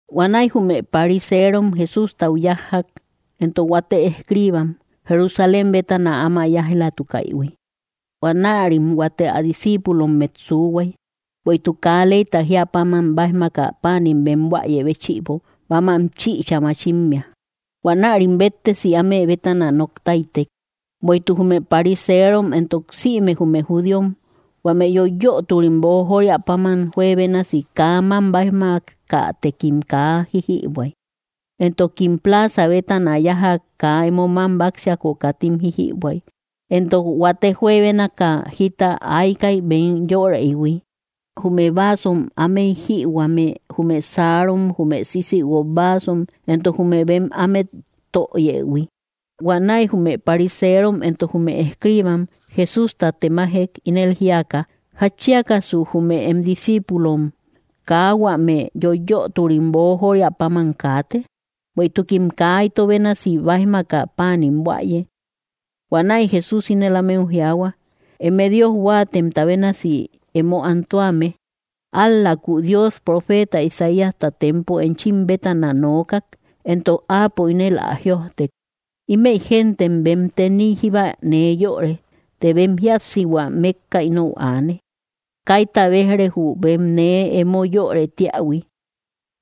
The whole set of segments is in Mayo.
Huanäi jume pariseerom Jesústau yájjak, entok huate escriibam, Jerusalén bétana áma yáij‑latukaïhui. Huanärim huate ä discíipulommet suuhuay, bueïtuk kaa leyta jíä páman báijmaka páanim bem buäye béchïbo mamam chichä machimmea. Huanärim béttesi áme bétana noktaitek. (Bueïtuk jume pariseerom entok sïme jume judíom, huame yoiyöturim boojoria páman, juebénasi kaa mam báijmakatekim kaa jíjïbuäy. Entokim plaza bétana yájak, kaa emo mam báksiako, katim jíjïbuäy. Entok huate juebénaka jita aykay bem yöreïhui: jume vasom ámey jïhuame, jume saarom, jume sisïguok vaasom, entok jume bem ámet töyëhui.) Huanäi jume pariseerom entok jume escribam Jesústa temajek, ínel jíaka: —¿Jatchiakasu jume em discíipulom kaa huame yoiyöturim boojoria páman kaate? Bueïtukim kaa ito bénasi báijmaka páanim buäye. Huanäi Jesús ínel ámeu jiaahua: —¡Eme Dios huáatemta bénasi emo antuame! Ál‑läku Dios profeeta Isaíasta tempo enchim bétana nookak, entok áapo ínel ä jïojtek: Ímëi gentem bem teniy jíba nee yöre, të bem jíapsihua mékka inou aane. Kaita béj‑re jü bem nee emo yörë tíähui,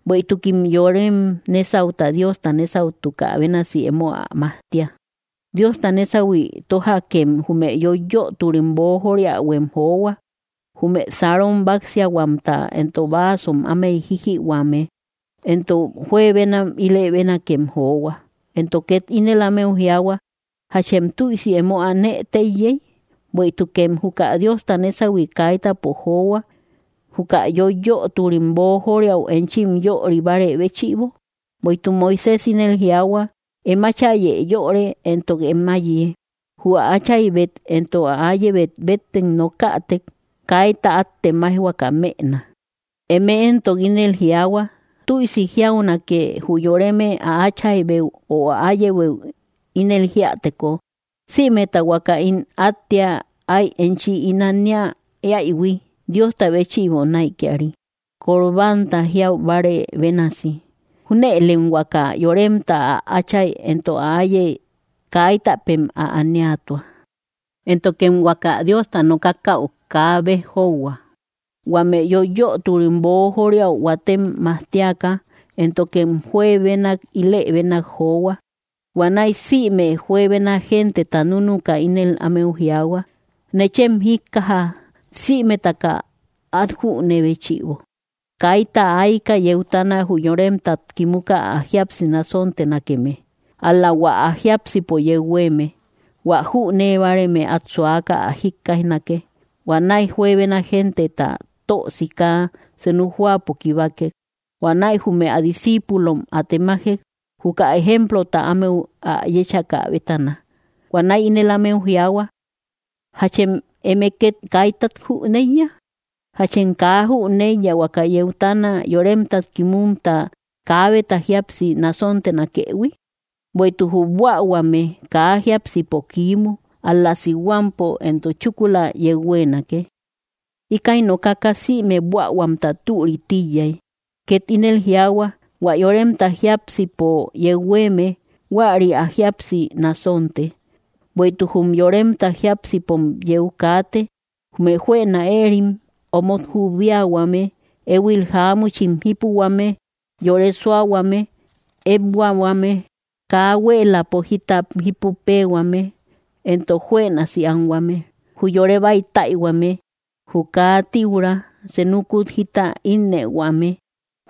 bueïtukim yorem nésauta Diosta nésautukä bénasi emo ä majtia. Diosta nésahui tójakem, jume yoiyöturim boojoriauem johua: jume sarom báksiahuamta, entok vasom ámey jijïhuame; entok juebenak ílë bénakem johua. Entok ket ínel ámeu jiaahua: —¿Jachem tüisi emo anë téiyey? ¡Bueïtukem juka Diosta nésahui kaitäpo johua, juka yoiyöturim boojoriau enchim yöri bárë béchïbo! Bueïtuk Moisés ínel jiaahua: “Em áchayë yöre, entok em áiye. Jü ä áchaybet entok ä áyebet bettek nokätek, kaita át temaijhuaka mëna.” Eme éntok ínel jiaahua: “Tüisi jiaunake jü yoreme ä áchaybeu o ä áyebeu ínel jíäteko: Sïmeta huaka ín áttea ay enchi ín ania éähui, Diosta béchïbo näikiari.” (Corbánta jiau bárë bénasi.) Júnëlem huaka yoremta ä atchai éntok ä áiye kaitäpem ä aniatua; éntokem huaka Diosta nookakäu kaa béj jóuhua, huame yoiyöturim boojoriau huatem majtiaka, éntokem juebenak ílë bénak johua. Huanäi sïme juebena genteta núnuka ínel ámeu jiaahua: —Nechem jíkkaja sïmetaka, át jünee béchïbo: Kaita ayka yeutana jü yoremtat kimuka ä jíapsi násontenakeme, ál‑la hua ä jiápsipo yeu huéeme. Huä jünee báareme át suaka ä jikkaijnake. Huanäi juebena genteta tö sika senu jóapo kibakek. Huanäi jume ä discíipulom ä temajek, juka ejemplota ámeu ä yéchakä bétana. Huanäi ínel ámeu jiaahua: —¿Jachem eme két kaitat jüneiya? ¿Jáchem kaa jüneiya, huaka yeutana yoremtat kimumta kaabeta jíapsi násontenakëhui? Bueïtuk jü buähuame kaa jiápsipo kiimu, ál‑la sihuampo, entok chúkula yeu huéenake. Íkäi nokaka sïme buähuamta türï tíiyay. Ket ínel jiaahua: —Huä yoremta jiápsipo yeu huéeme, huäri ä jíapsi nasonte. Bueïtuk jum yoremta jiápsipom yeu kaate, jume juëna éerim, omot jubiahuame, éhuil jáamuchim jípuhuame, yore súahuame, ékbuahuame, kaa huéeläpo jita jípu péehuame, entok juënasi anhuame, jü yore bäitäihuame, jü kaa tíura, senukut jita ínnëhuame,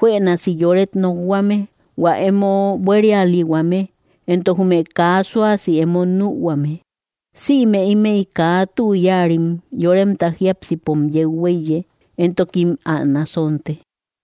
juënasi yoret nokhuame, hua emo buérialihuame, entok jume kaa suasi emo nühuame. Sïme ímëi kaa tü yáarim yoremta jiápsipom yeu huéiye, entokim ä nasonte.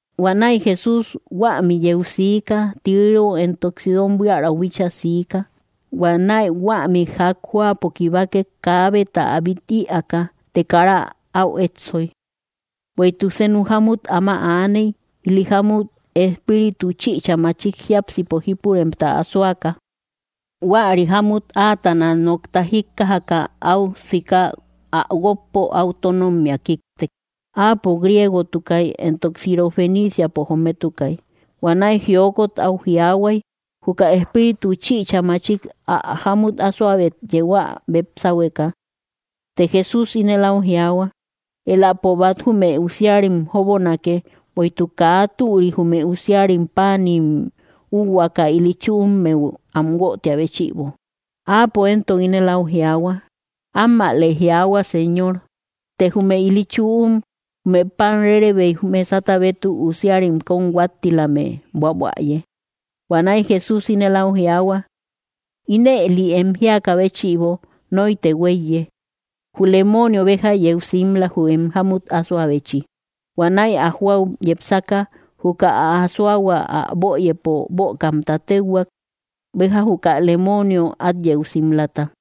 Huanäi Jesús huämi yeu sika Tiró éntok Sidón buiärau bíchaa siika. Huanäi huämi jak jóapo kibakek kaabeta ä bít ïaaka. Të kara au éssoy. Bueïtuk senu jámmut áma aaney, ili jámut espíritu chïcha machik jiápsipo jípuremta asoaka. Huäri jámmut áatana nokta jíkkajaka, áu sika ä guókpo áu tónommia kíktek. Áapo griegotukay, entok Sirofeniciapo jometukay. Huanäi jiokot áu jiaahuay, juka espíritu chïcha machik ä jámut asoabet yeu ä bep sáhueka. Të Jesús ínel au jiaahua: —Éläpo bat jume usiarim jóbonake, bueïtuk kaa türi jume usiarim páanim úuhuaaka ili chüummeu am guötia béchïbo. Áapo éntok ínel áu jiaahua: —Ammäle jiaahua, Señor, të jume ili chüum jume pan rérebeim mesata bétuk usiarim kóm huáttilame buabuäye. Huanäi Jesús ínel áu jiaahua: —Ínëli em jíakä béchïbo noitë huéiye. Jü lemoonio béja yeu simla, jü em jámut asoabechi. Huanäi ä jóau yepsaka, juka ä asoahua ä böyëpo bökamta téuhuak, béja juka lemoonio át yeu simlata.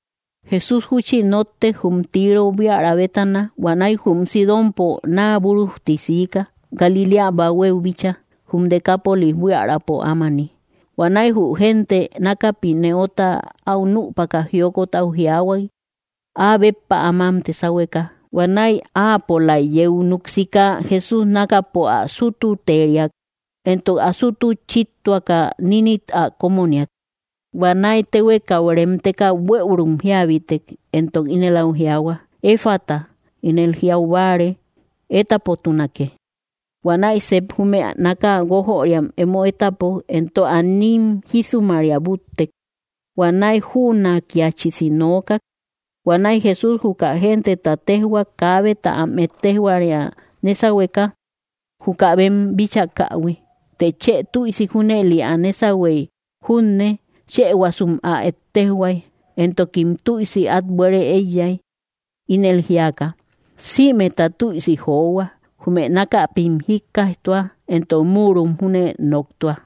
Jesús júchi nóttek jum Tiro buiära bétana. Huanäi jum Sidonpo naa búrujti siika, Galiléa bahuéu bíchaa, jum Decápolis buiärapo ámani. Huanäi jü gente nákapi nëota áu nüpaka jiokot au jiaahuay, áa béppa ä mámte sáhueka. Huanäi áapolaik yeu núk sika, Jesús nákapo ä sútuteriak, entok ä sútu chíttuaka nínit ä kómoniak. Huanäi téhuekau reemteka bueürum jíabitek, entok ínel áu jiaahua: —¡Efata! —ínel jiau báare: ¡Étapotunakee! Huanäi sep jume náka guójöriam emo étapok, entok ä nín jísumaria búttek. Huanäi jünakiachisi nookak. Huanäi Jesús juka genteta téjhuak, kaabeta am ettejoria nésahueka, juka bem bíchakähui. Të chë tüisi junëli ä nésahuey junne, chëhuasum ä ettejhuay. Entokim tüisi át buere eeyak, ínel jíaka: —¡Sïmeta tüisi johua! ¡Jume nákapim jíkkaijtua, entok múurom júne noktua!